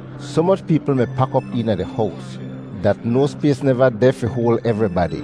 Soh moch peepl mi pak op eena di hows dat no spays neva deh fi hoal evribadi,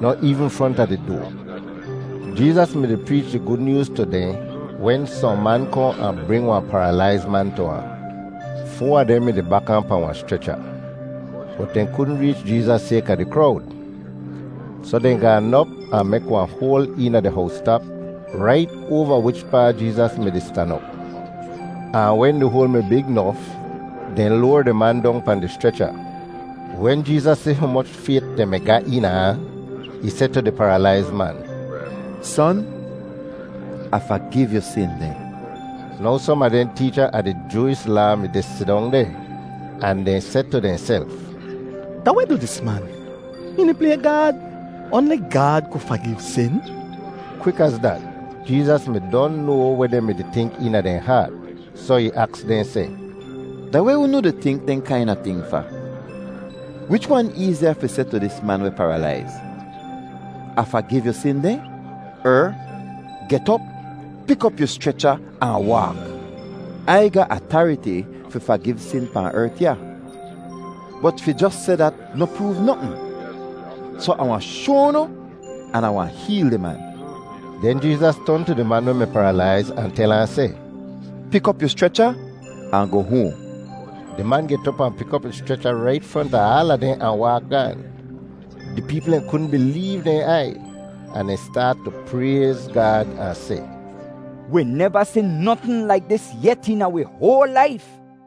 noh eevn fronta di doa. Jeezas mi-di preech di Gud Nyooz tu dehn wen sohn man kohn ahn bring wahn paralaiz man tu ahn; foa a dehn mi-di bak ahn pahn wahn schrecha, bot dehn kudn reech Jeezas sayka di krowd. Soh dehn gaan op ahn mek wahn hoal eena di howstap rait oava wichpaa Jeezas mi-di stan op, ahn wen di hoal mi big nof, dehn loar di man dong pahn di schrecha. Wen Jeezas si humoch fayt dehn mi ga eena ahn, ih seh tu di paralaiz man, “Son, Ah fagiv yu sin dehn.” Now som a dehn teecha a di Jooish Laa mi-di sidong deh ahn dehn seh tu dehnself, “Da weh du dis man? Hihn di play Gaad! Oanli Gaad ku fagiv sin!” Kwik az dat, Jeezas mi don noa weh dehn mi-di tink eena dehn haat, soh ih aks dehn seh, “Da weh unu di tink dehn kaina ting fa? Wich wan eeziya fi seh tu dis man weh paralaiz, ‘Ah fagiv yu sin dehn,’ er ‘Get op, pik op yu schrecha ahn waak?’ Ai ga atariti fi fagiv sin pahn ert ya. Bot fi jos seh dat noh proov notn, soh Ah wahn shoa unu an Ah wahn heel di man.” Den Jeezas ton tu di man weh mi paralaiz ahn tel ahn seh, “Pik op yu schrecha ahn goh hoahn.” Di man get op ahn pik op ih schrecha rait fronta aala dehn ahn waak gaan. Di peepl dehn kudn bileev dehn aiy ahn dehn staat tu prayz Gaad ahn seh, “Wi neva si notn laik dis yet eena wi hoal laif!”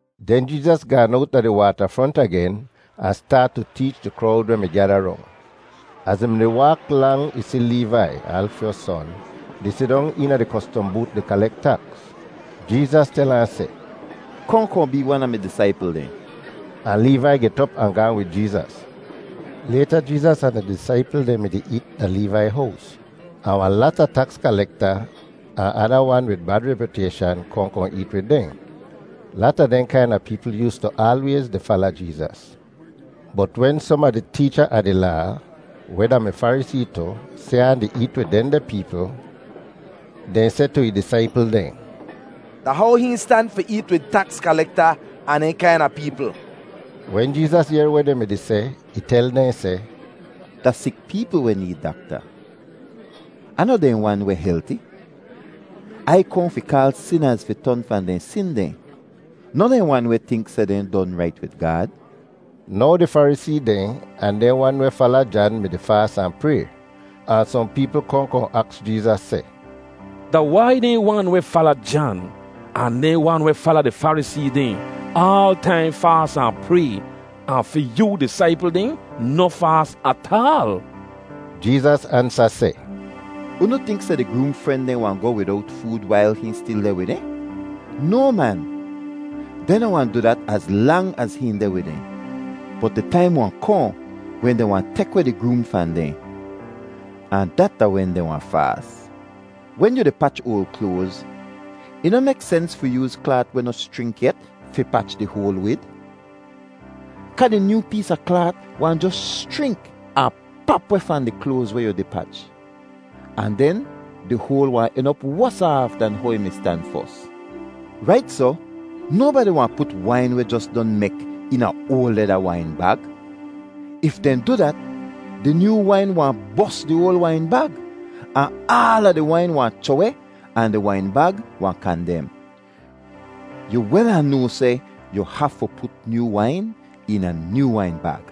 Den Jeezas gaan owt da di waatafront agen ahn staat tu teech di krowd weh mi gyada rong. Az ih mi-di waak lang ih si Leevai, Alfyos son, di sidong eena di kostom boot di kalek taks. Jeezas tel ahn seh, “Kohn kohn bee wan a mi disaipl dehn.” Ahn Leevai get op ahn gaahn wid Jeezas. Layta Jeezas ahn ih disaipl dehn mi-di eet da Leevai hows, ahn wahn lata taks kalekta ahn ada wan wid bad repyutayshan kohn kohn eet wid dehn. Lata dehn kaina peepl yoostu aalwayz di fala Jeezas. Bot wen som a di teecha a di Laa, weh da-mi Farisee tu, si ahn di eet wid dehndeh peepl, dehn seh tu ih disaipl dehn, “Da how hihn stan fi eet wid taks kalekta ahn dehn kaina peepl?” Wen Jeezas yehr weh dehn mi-di seh, ih tel dehn seh, “Da sik peepl weh need dakta, ahn noh dehn wan weh helti. Ai kohn fi kaal sinaz fi ton fahn dehn sin dehn, noh dehn wan weh tink seh dehn don rait wid Gaad.” Now di Farisee dehn ahn dehn wan weh fala Jan mi-di faas ahn pray; ahn sohn peepl kohn kohn aks Jeezas seh, “Da wai dehn wan weh fala Jan ahn dehn wan weh fala di Farisee dehn aal taim faas ahn pray ahn fi yoo disaipl dehn noh faas ataal?” Jeezas ansa seh, “Unu tink seh di groom fren dehn wahn goh widowt food wail hihn stil deh wid dehn? No, man! Dehn noh wahn du dat az lang az hihn deh wid dehn. Bot di taim wahn kohn wen dehn wahn tek weh di groom fahn dehn, ahn dat da wen dehn wahn faas. Wen yu di pach oal kloaz, ih noh mek sens fi yooz klaat weh noh schrink yet fi pach di hoal wid, kaa di nyoo pees a klaat wahn jos schrink ahn pap weh fahn di kloaz weh yu di pach. Ahn den di hoal wahn en op wosa aaf dan how ih mi stan fos. Rait soh, nobadi wahn put wain weh jos don mek eena oal leda wain bag. If dehn du dat, di nyoo wain wahn bos di oal wain bag, ahn aala di wain wahn chroh-weh ahn di wain bag wahn kandem. Yu wel ahn noa seh yu hafu put nyoo wain eena nyoo wain bag.”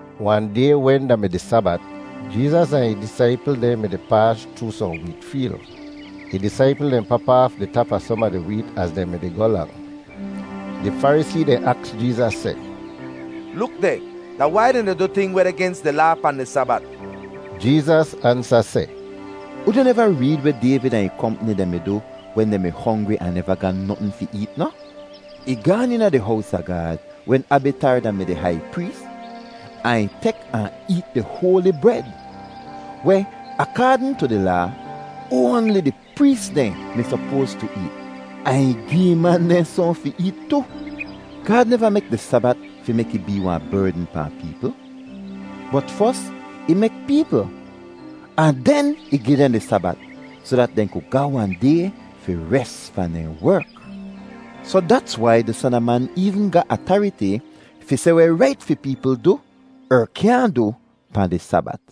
Wahn day wen da mi di Sabat, Jeezas ahn ih disaipl dehn mi-di paas chroo sohn weet feel. Ih disaipl dehn pap aaf di tap a som a di weet az dehn mi-di goh lang. Di Farisee dehn aks Jeezas seh, “Luk deh! Da wai dehn di du ting weh deh gens di Laa pahn di Sabat?” Jeezas ansa seh, “Unu neva reed weh Dayvid ahn ih kompni dehn mi du wen dehn mi hongri ahn neva ga notn fi eet noh? Ih gaan eena di hows a Gaad wen Abitar da-mi di hai prees ahn ih tek ahn eet di hoali bred weh, akaadn tu di Laa, oanli di prees dehn mi sopoas tu eet; ahn ih gi ih man dehn sohn fi eet tu. Gaad neva mek di Sabat fi mek ih bee wahn berdn pahn peepl, bot fos ih mek peepl ahn den ih gi dehn di Sabat soh dat dehn ku ga wahn day fi res fahn dehn werk. Soh dats wai di Son a Man eevn ga atariti fi seh weh rait fi peepl du er kyaahn du pahn di Sabat.”